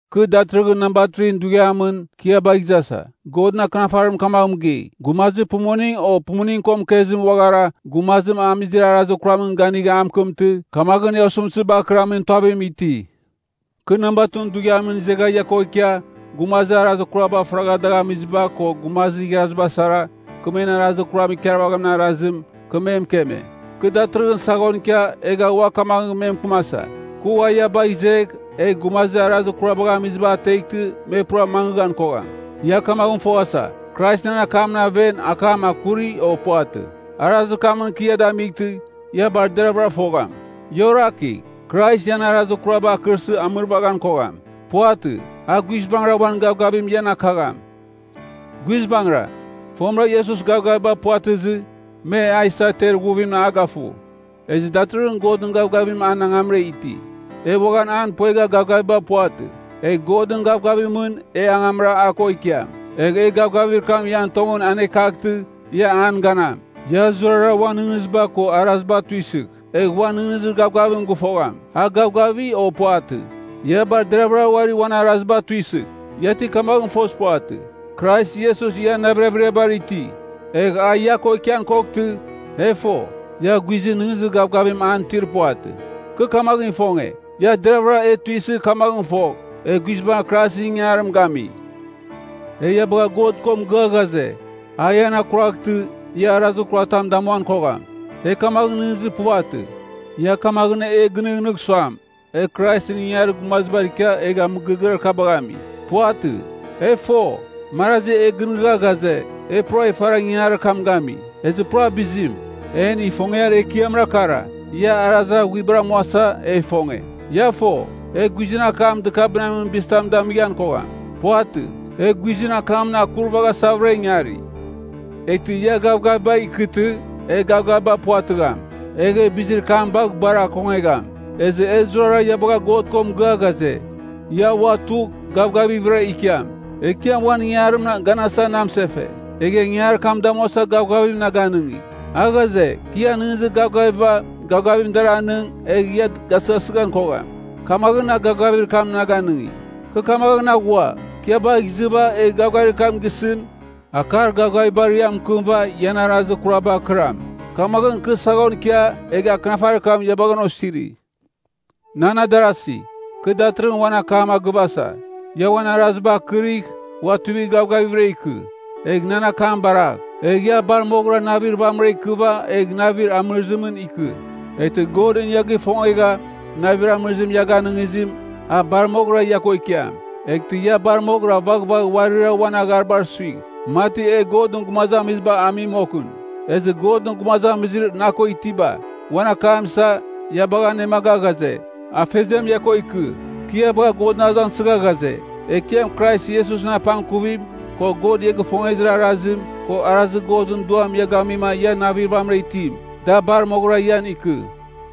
Kɨ datɨrɨghɨn namba 3ɨn dughiamɨn, kɨ ia bagh izasa. Godɨn Akɨnafarim kamagh mɨgei, “Gumazir pumuning, o pumuning ko mɨkezim uaghara, gumazim amizir arazir kuramɨn ganigh a mɨkɨmtɨ, kamaghɨn e osɨmtɨzibar akɨramin tuavim iti.” Kɨ namba 2ɨn dughiamɨn izegha ia ko ikia, gumazir arazir kuraba faragha dagh amiziba, ko gumazir igharaziba sara, kɨ men arazir kuram ikarvaghamin arazim, kɨ me mɨkeme. Kɨ datɨrɨghɨn saghon ikia, egha ua kamaghɨn me mɨkɨmasa, kɨ ua ia bagh izegh, egh gumazir arazir kurabagh amiziba ateghtɨ me pura mangɨghan kogham. Ia kamaghɨn foghasa, Krais nan akamɨn aven, akam akuri, o puvatɨ. Arazir kamɨn kɨ ia damightɨ, ia bar deraghvɨra fogham. Ia orakigh. Krais ian arazir kuraba akɨrsɨ amɨrvaghan kogham. Puvatɨ. A guizbangɨra uan gavgavim ian akagham. Guizbangɨra, fomɨra Iesus gavgaviba puvatɨzɨ, me a isa ter ighuvimɨn a gafu. Ezɨ datɨrɨghɨn Godɨn gavgavimɨn an angamra iti. E uaghan an puegha gavgaviba puvatɨ. Egh Godɨn gavgavimɨn, e angamra a ko ikiam. Egh e gavgavir kam ian tongɨn anekaghtɨ, ia an ganam. Ia zurara uan nɨghnɨziba ko araziba tuisɨgh, egh uan nɨghnɨzir gavgavim gɨfogham, a gavgafi, o puvatɨ. Ia bar deraghvɨra uari uan araziba tuisɨgh. Ia ti kamaghɨn fozir puvatɨ, Krais Iesus ian navir averiabar iti? Egh a ia ko ikian koghtɨ, e fo, ia guizɨn nɨghnɨzir gavgavim an itir puvatɨ. Kɨ kamagh ifonge, ia deravɨra e tuisɨgh kamaghɨn fogh, e guizbangɨra Kraisɨn ingangarim gami. E ia bagha Godɨn ko mɨgɨa ghaze, a ian akuraghtɨ, ia arazir kuratam damuan kogham. E kamaghɨn nɨghnɨzir puvatɨ, ia kamaghɨn e gɨnɨghnɨgh suam, e Kraisɨn ingangarir gumazibar ikia egha mɨgɨrɨgɨar kabagh ami. Puvatɨ. E fo, marazi e gɨnɨghnɨgha ghaze, e pura ifara ingangarir kam gami. Ezɨ pura bizim. En ifongiar ekiamra kara, ia arazir aghuibara amuasa, e ifonge. Ia fo, e guizɨn akam dɨkabɨnamin bizitam damighan kogham. Puvatɨ, e guizɨn akamɨn akurvaghasavɨra ingari. Eghtɨ ia gavgaviba ikɨtɨ, e gavgaviba puvatɨgham, egh e bizir kam bagh bar akongegham. Ezɨ e zurara ia bagha God ko mɨgɨa ghaze, ia ua tugh, gavgavighvɨra ikiam. Ekiam uan ingangarimɨn ganasava na mɨsefe, egha ingangarir kam damuasa gavgavim na ganɨngi. A ghaze, kɨ ian nɨghnɨzir gavgaviba, gavgavim dar anɨng, egh ia gasɨghasɨghan kogham, kamaghɨn a gavgavir kam na ganɨngi. Kɨ kamaghɨn aghua, kɨ ia bagh izɨva, egh gavgavir kam gisɨn, akar gavgavibar ia mɨkɨmɨva ian arazir kurabar kɨram. Kamaghɨn, kɨ saghon ikia, egha akɨnafarir kam ia bagha an osiri. Nan adarasi, kɨ datɨrɨghɨn uan akam agɨvasa. Ia uan araziba akɨrigh, ua tuivigh gavgavighvɨra ikɨ. Egh nan akam baragh. Egh ia bar moghɨra navir vamɨra ikɨva egh navir amɨrɨzimɨn ikɨ. Eghtɨ Godɨn ia gifongegha, navir amɨrɨzim ia ganɨngizim, a bar moghɨra ia ko ikiam. Eghtɨ ia bar moghɨra vaghvagh uarira uan agharibar suigh, mati e Godɨn gumazamiziba ami moghɨn. Ezɨ Godɨn gumazamizir na ko itiba, uan akam isa, ia bagha anemaga ghaze, Afeziam ia ko ikɨ. Kɨ ia bagha Godɨn azangsɨgha ghaze, Ekiam Krais Iesusɨn apangkuvim, ko God ia gifongezir arazim, ko arazir Godɨn Duam ia gamima ia navir vamɨra itim, da bar moghɨra ian ikɨ.